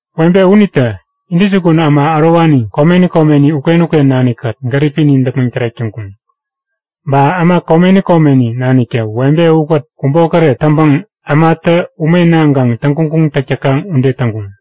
Webe unitä intäjukun äma ärowani komeni komeni uken-uken nanikkät gäripini däpmäŋ tärek täŋkuŋ. Ba äma komeni komeni naniktä webe ukät kubokäret täŋpäŋ ämatä ume naŋkaŋ täŋguŋguŋ täk täkaŋ ude täŋkuŋ.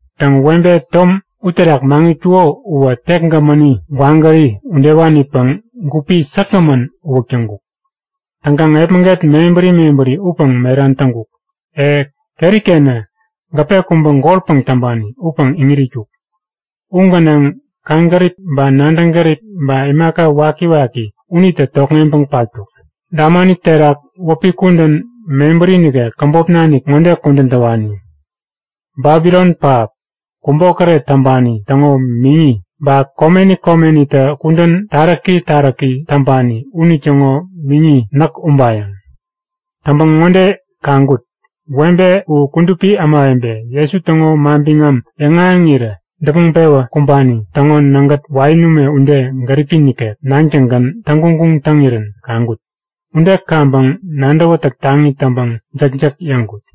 Täŋ, webe tom uterak maŋitkuko uwä tek gämäni gwagäri udewanipäŋ gupi säkgämän uwäk täŋkuk. Täŋkaŋ epmäget mebäri mebäri upäŋ meran täŋkuk. E, keri-kenä gäpe kubä golpäŋ täŋpani upäŋ iŋit itkuk. U gänaŋ kaŋgärip ba nadäŋ gärip ba imaka wakiwaki unitä tokŋeŋpäŋ patkuk. Dämani terak wäpi kudän mebäri nikek, käbop nanik ŋode kudän täwani; Babilon Pähap Kubokäret Täŋpani Täŋo Miŋi, Ba Komeni Komenitä Kudän Taräki Taräki Täŋpani Unitäŋo Miŋi Näk Ubayäŋ. Täŋpäŋ ŋode kaŋkut; Webe u kudupi ämawebe, Jesu täŋo manbiŋam yäŋahäŋirä däpmäŋ-pewä kumbani täŋo nägät wain ume ude gäripi nikek näŋtäŋgän täŋguŋguŋ taŋirän kaŋkut. Ude kaŋpäŋ nadäwätäk taŋi täŋpäŋ jäkjäk yäŋkut.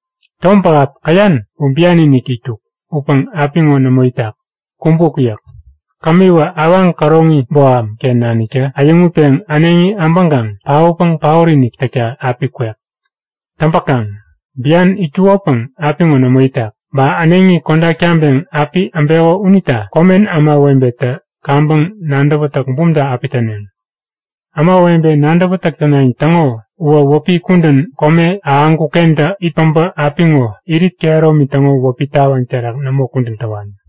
Tom pähap käyan u bian-inik itkuk. Upäŋ apiŋo nämo itak, kumbuk yäk. Kämiwä awaŋ käroŋi boham-ken naniktä äyäŋutpeŋ äneŋi äbäŋkaŋ paotpäŋ paot-inik täkta api kwek. Täŋpäkaŋ bian itkukopäŋ apiŋo nämo itak, ba äneŋi kodak taŋpeŋ api äbeko unita komen ämawebetä kaŋpäŋ nadäwätäk bumta api täneŋ. Ämawebe nadäwätäk tänayäŋ täŋo uwä wäpi kudän kome ahäŋkuk-kentä it päbä apiŋo irit kehäromi täŋo wäpi tawaŋ terak nämo kudän täwani.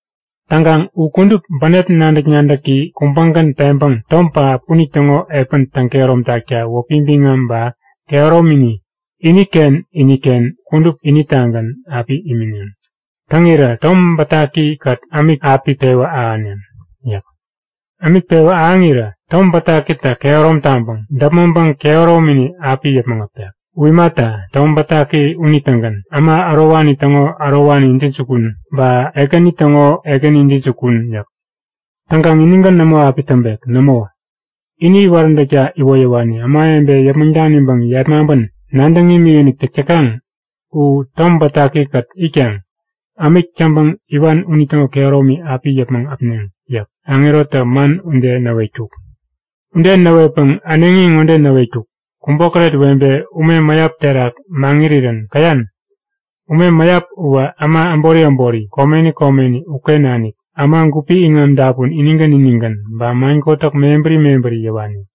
Täŋkaŋ u kudup bänep nadäk-nadäki kubägän peŋpäŋ tom pähap unitäŋo epän täŋkehärom takta wäpi biŋam ba kehäromini iniken iniken kudup unitagän api imineŋ. Täŋirä Tom Bätaki-kät ämik api pewä ahäneŋ yäk. Ämik pewä ahäŋirä Tom Bätakitä kehärom taŋpäŋ däpmäŋpäŋ kehäromini api yäpmäŋ äpek. U imata, Tom Bätaki unitägän äma ärowani täŋo ärowani intäjukun ba ekäni täŋo ekäni intäjukun yäk. Täŋkaŋ inigän nämo api täŋpek. Nämo, ini iwaräntäkta iwoyäwani, ämawebe yäpmäŋ daniŋpäŋ yepmaŋpän nadäŋ imikinik täk täkaŋ u Tom Bätaki-kät itkaŋ ämik täŋpäŋ iwan unitäŋo kehäromi api yäpmäŋ äpneŋ yäk. Aŋerotä man ude näwetkuk. Ude näwetpäŋ äneŋi ŋode näwetkuk; Kubokäret webe ume mäyap terak maŋirirän käyan? Ume mäyap uwä äma äbori äbori, komeni komeni uken nanik, äma gupi iŋam dapun inigän inigän, ba man kotäk mebäri mebäri yäwani.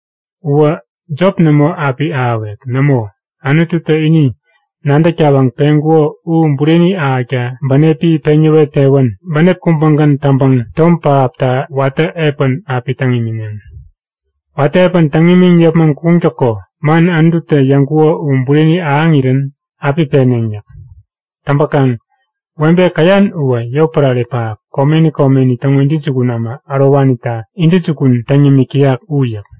Uwä jop nämo api ahäwek. Nämo, Anututä ini nadäk tawaŋ peŋkuko u bureni ahäkta bänepi peŋ yäwet-pewän bänep kubägän täŋpäŋ tom pähapta watä epän api täŋ imineŋ. Watä epän täŋ imiŋ yäpmäŋ kuŋtäko man Anututä yäŋkuko u bureni ahäŋirän api peneŋ yäk. Täŋpäkaŋ webe käyan uwä yotpärare pähap, komeni komeni täŋo intäjukun äma ärowanita intäjukun täŋ yämik täyak u yäk.